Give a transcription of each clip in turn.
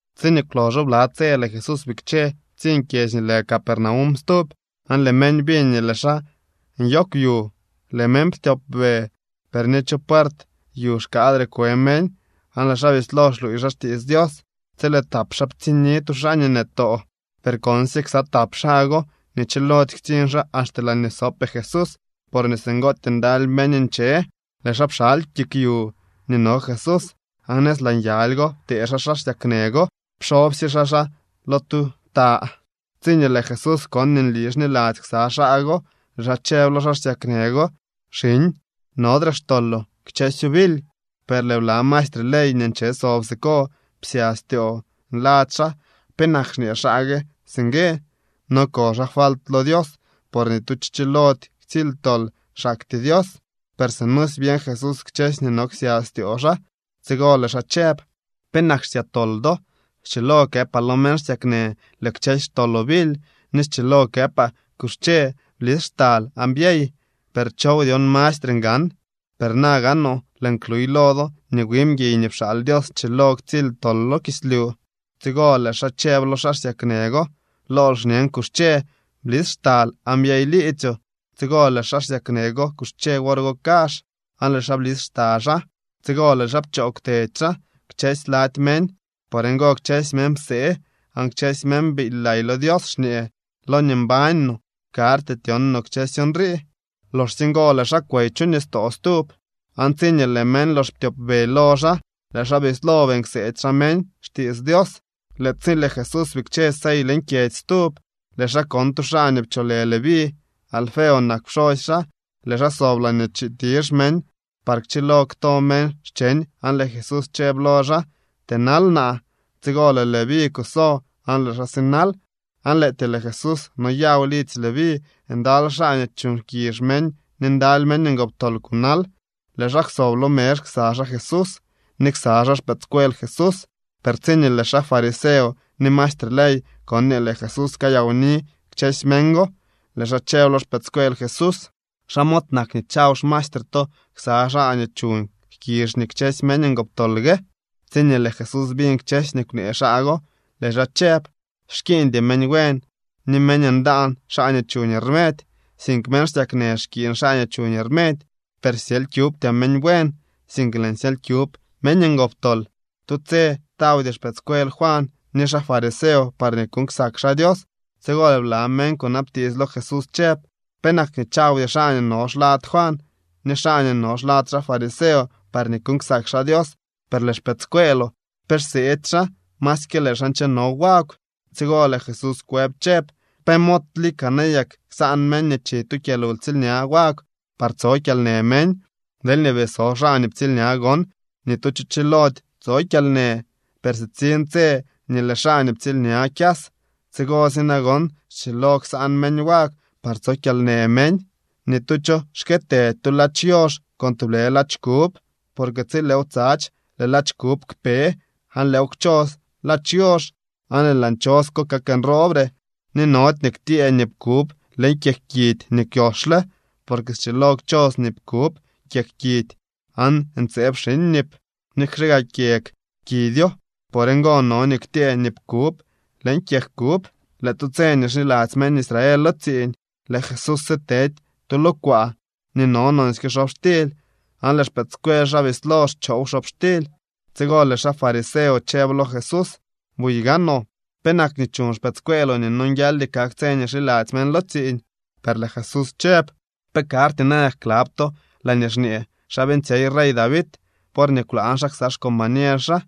Tsiñee kwloxo bla tse lëë Jesús bikche ptsiñ kyedzy nii lë Capernaum stub. Aan lëë meñ biñ nii lëë xaa nyoogw yu. Lëë meñ ptyopbe, per ni chu puert yu xkaadre kwe meñ. Aan lëë xaa bislo xluuy xaa xtiits Dios tsi lëë tap xaa ptsiñni tu xaa nii nëtoo. Per konsye ksa tap xaa go nii chilody ktsiñ xaa axte laañee sopee Jesús porñee singootyee ndaly meñ nche, lëë xaa pxaly kik yu nii no Jesús, aan nëz laa nyaly go ptee xaa xaa xsyaknë go pxobsye xaa xaa lo tu ta. Tsiñee lëë Jesús kon nii nli xniladzy ksa xaa go, lëë xaa chëb lo xaa xsyaknë go: —Xiñ, nodre xtoloo. Kchësyo bily. Per lëë bla maestre ley nii nche sob siko psya styoo nladzy xaa: “¿Penak xñee xaa gue singue? No ko xaa falt lo Dios por ni tu cho chilody ktsily tol, xaktyee Dios.” Per sinusy byeñ Jesús kchësy nii no ksya styoo xaa. Tsigo lëë xaa chëb: —¿Penak xsya tol do? Schilo këpaa lo meñ xsyaknë: “Lëë kchësy xtoloo bily”, ni schilo këpaa: “Kuxche, blis xtal aan byey”, per ¿chow dyon mastre ngan? Per na gaanoo lëën kluy lo do nii wi mguiy nii pxaal Dios schilo ktsily tol lo kislyu. Tsigo lëë xaa chëb lo xaa xsyaknë go: —Lool xñen, kuxche, blis xtal aan byey liidzyoo. Tsigo lëë xaa xsyaknë go kuxche wor go kazh, aan lëë xaa blis xta xaa. Tsigo lëë xaa pchoo kwtedy xaa kchësy lady meñ. Por ngo, kchësy meñ psee aan kchësy meñ biily lay lo Dios xñee: —Loñee mbañ no karty tyon no kchësy nrii. Loxsye ngo lëë xaa kwey chu nistoo stub, aan tsiñee lëë meñ lox ptyopbe lo xaa, lëë xaa bislo beeñ kseedy xaa meñ xtiits Dios. Lëë tsi lëë Jesús bikche sey leñ kyedzy stub, lëë xaa kon tu xaa nii pcholë Leví. Alfeo nak pxosy xaa. Lëë xaa sob laañee chitizh meñ par kchilo kto meñ xcheñ aan lëë Jesús chëb lo xaa: —Tënal naa. Tsigo lëë Leví kuso aan lëë xaa sinal. Aan lëëtyee lëë Jesús noyaw lidzy Leví. Ndaly xaa nii chuuñ jkizh meñ ni ndaly meñ ngoptol kunal. Lëë xaa kwsob lo mezh ksa xaa Jesús ni ksa xaa xpëëdscuel Jesús. Per tsiñee lëë xaa fariseo ni maestre ley kon nii lëë Jesús kayawni kchësy meñ go, lëë xaa chëb lo xpëëdscuel Jesús: —¿Xa mod nak nii chaw xmaestre to ksa xaa nii chuuñ jkizh ni kchësy meñ ngoptol gue? Tsiñee lëë Jesús biñ kchësy nii kwnee xaa go, lëë xaa chëb: —Xkiiñdy meñ buen ni meñ ndaan xaa nii chuñ rmedy, sink meñ xsyaknë xkiiñ xaa nii chuñ rmedy. Per syely kyubtyaa meñ buen, sink lëën syely kyub meñ ngoptol. Tu tse tawdy xpëëdscuel Juan ni xaa fariseo parñee kuuñ ksak xaa Dios. Tsigo lëë bla meñ kunabtiits lo Jesús chëb: —¿Penak nii chawdy xaa nii no xlad Juan ni xaa nii no xlad xaa fariseo parñee kuuñ ksak Dios, per lëë xpëëdscueeloo pe xseedy xaa masyke lëë xaa ncheno wagw? Tsigo lëë Jesús kwëb chëb: —¿Pe mod lika nayak ksaan meñ nii chi lo tu kyalwtsiilña wagw par tso kyalnë meñ? Deelñee bii so xaa nii ptsiilña gon, ni tu cho chilody tso kyalnë. Per sitsiñ tse nii lëë xaa nii ptsiilña kyas. Tsigosy nagon schilo ksaan meñ wagw par tso kyalnë meñ. ’Ni tu cho xkëtëdy tu ladx yoox con tublë ladx kub. Por tsi lëëw tsadx, lëë ladx kub kpe aan lëëw kchos ladx yoox, aan lëë laa nchos ko kak nroobre. Ni nody nii ktyëë nip kub leñ kyeg kidy nii kwyoxle. Porque schilo kchos nip kub kyeg kidy, aan ntseeb xiñ nip, nikxe gaa kyeg kidyo. Por ngo no nii ktyëë nip kub leñ kyeg kub. Lëë tu tse nii xiladzy meñ Israel lo tsiiñ lëë Jesús sitedy tu lo kwaa nii no nonsyke xobxtily, aan lëë xpëëdscuel xaa bislo xchoow xobxtily. Tsigo lëë xaa fariseo chëb lo Jesús: —Buy gaanoo, ¿penak nii chuñ xpëëdscueeloo nii nonguialdy kak tse nii xiladzy meñ lo tsiiñ? Per lëë Jesús chëb: —¿Pe karty nayak klab to laañee xñee xa beeñtsyey rey David worñee kwlaañ xaa ksa xcombañer xaa?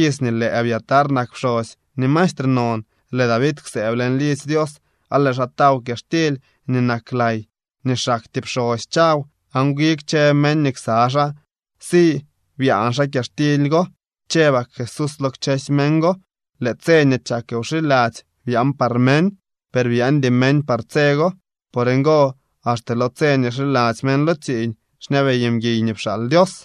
Iz nii lëë Abiatar nak pxosy nii mastre non, lëë David kwsëëb leñ lidzy Dios aan lëë xaa taw kyaxtily nii nak lay nii xaktyee pxosy chaw, aan wi kchë meñ nii ksa xaa si byaan xaa kyaxtily go. Chëbak Jesús lo kchësy meñ go: —Lëë tse nii chak wxiladzy byaan par meñ, per byaandy meñ par tse go. Por ngo, axte lo tse nii xiladzy meñ lo tsiiñ xñabey mguiy nii pxaal Dios.